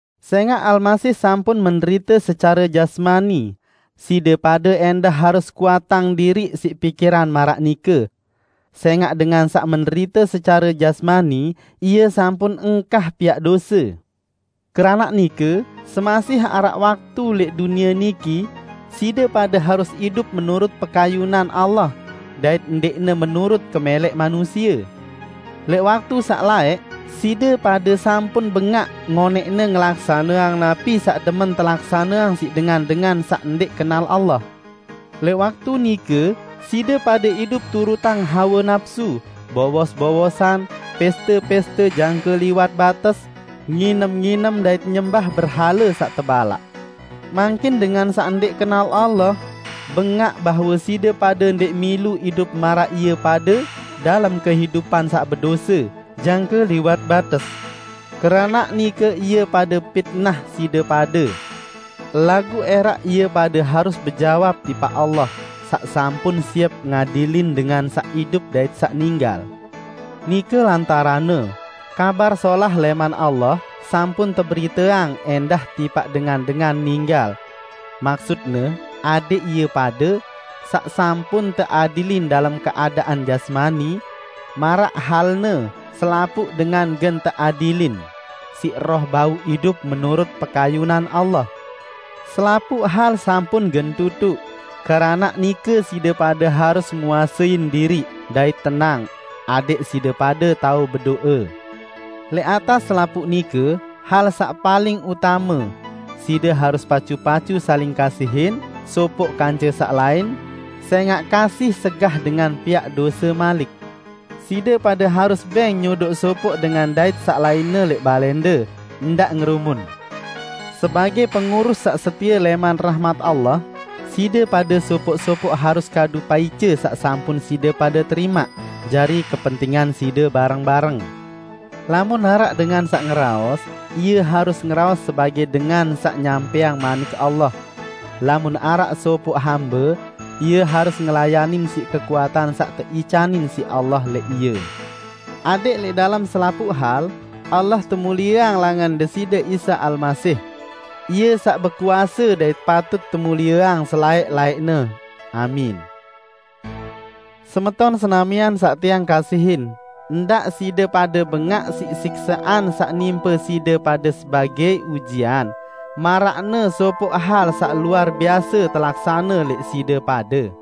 Sẽngaq Almasih sampun menderite secare jasmani, side pade ẽndah harus kuatang diriq siq pikiran maraq nike. Sẽngaq dengan saq menderite secare jasmani, ie sampun engkah piaq dose. Keranaq nike, semasih araq waktu lẽq dunie niki side pade harus idup menurut pekayunan Allah, dait ndẽqne menurut kemẽlẽq manusie. Lẽq waktu saq laẽq, side pade sampun bẽgaq ngonẽqne ngelaksaneang napi saq demen telaksaneang siq dengan-dengan saq ndẽq kenal Allah. Lẽq waktu nike side pade idup turutang hawe napsu, bowos-bowosan, pẽste-pẽste jangke liwat bates, nginem-nginem dait nyembah berhale saq tebalaq. Mangkin dengan saq ndẽq kenal Allah, bengaq bahwe side pade ndẽq milu idup maraq ie pade dalem kehidupan saq bedose jangke liwat bates. Keranaq nike ie pade pitnah side pade. Laguq ẽraq ie pade harus bejawab tipaq Allah saq sampun siep ngadilin dengan saq idup dait saq ninggal. Nike lantaranne, Kabar Solah lẽman Allah sampun teberiteang ẽndah tipaq dengan-dengan ninggal. Maksutne adẽq ie pade, saq sampun teadilin dalem keadaan jasmani -- maraq halne selapuq dengan gen teadilin -- siq roh bau idup menurut pekayunan Allah. Selapuq hal sampun gen tutuq, keranaq nike side pade harus nguasein diriq dait tenang, adẽq side pade tao bedo'e. Lẽq atas selapuq nike, hal saq paling utame: Side harus pacu-pacu saling kasihin sopoq kance saq lain, sẽngaq kasih segah dengan piaq dose malik. Side pade harus bẽng nyodoq sopoq dengan dait saq lainne lẽq balẽnde, ndaq ngerumun. Sebagẽ pengurus saq setie lẽman rahmat Allah, side pade sopoq-sopoq harus kadu paice saq sampun side pade terimaq jari kepentingan side bareng-bareng. Lamun araq dengan saq ngeraos, ie harus ngeraos sebagẽ dengan saq nyampẽang Manik Allah. Lamun araq sopoq hambe, ie harus ngelayanin siq kekuatan saq teicanin siq Allah lẽq ie, adẽq lẽq dalem selapuq hal Allah temulieang langan Deside Isa Almasih. Ie saq bekuase dait patut temulieang selaẽq-laẽqne. Amin. Semeton senamian saq tiang kasihin, ndaq side pade bengaq siq siksaqan saq nimpe side pade sebagẽ ujian, maraqne sopoq hal saq luar biase telaksane lẽq side pade.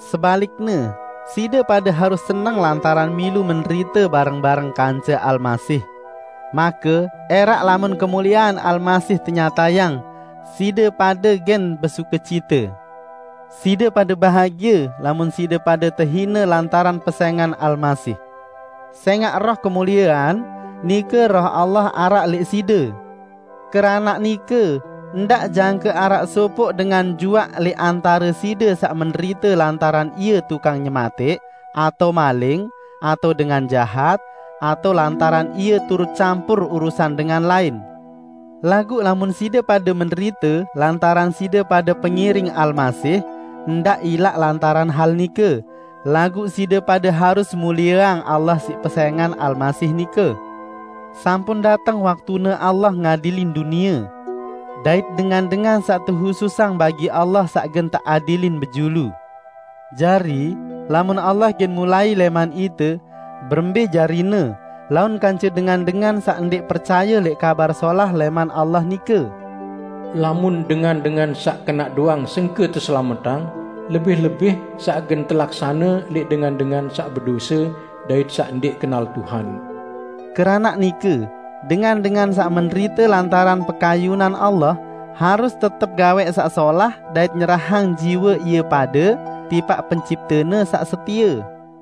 Sebalikne, side pade harus seneng lantaran milu menderite bareng-bareng kance Almasih. Make ẽraq lamun kemuliean Almasih tenyatayang, side pade gen besukecite. Side pade bahagie lamun side pade tehine lantaran pesẽngan Almasih, sẽngaq Roh kemuliean, nike Roh Allah araq lẽq side. Keranaq nike, ndaq jangke araq sopoq dengan juaq lẽq antare side saq menderite lantaran ie tukang nyematẽq, atao maling, atao dengan jahat, atao lantaran ie turut campur urusan dengan lain. Laguq lamun side pade menderite lantaran side pade pengiring Almasih, ndaq ilaq lantaran hal nike, laguq side pade harus mulieang Allah siq pesẽngan Almasih nike. Sampun dateng waktune Allah ngadilin dunie. Dait dengan-dengan saq tehususang bagi Allah saq gen teadilin bejulu. Jari, lamun Allah gen mulai lẽman ite, berembẽ jarine laun kance dengan-dengan saq ndẽq percaye lẽq Kabar Solah lẽman Allah nike? "Lamun dengan-dengan saq kenaq doang sengke teselametang, lebih-lebih saq gen telaksane lẽq dengan-dengan saq bedose dait saq ndẽq kenal Tuhan." Keranaq nike, dengan-dengan saq menderite lantaran pekayunan Allah, harus tetep gawẽq saq solah dait nyerahang jiwe ie pade tipaq Penciptene saq setie.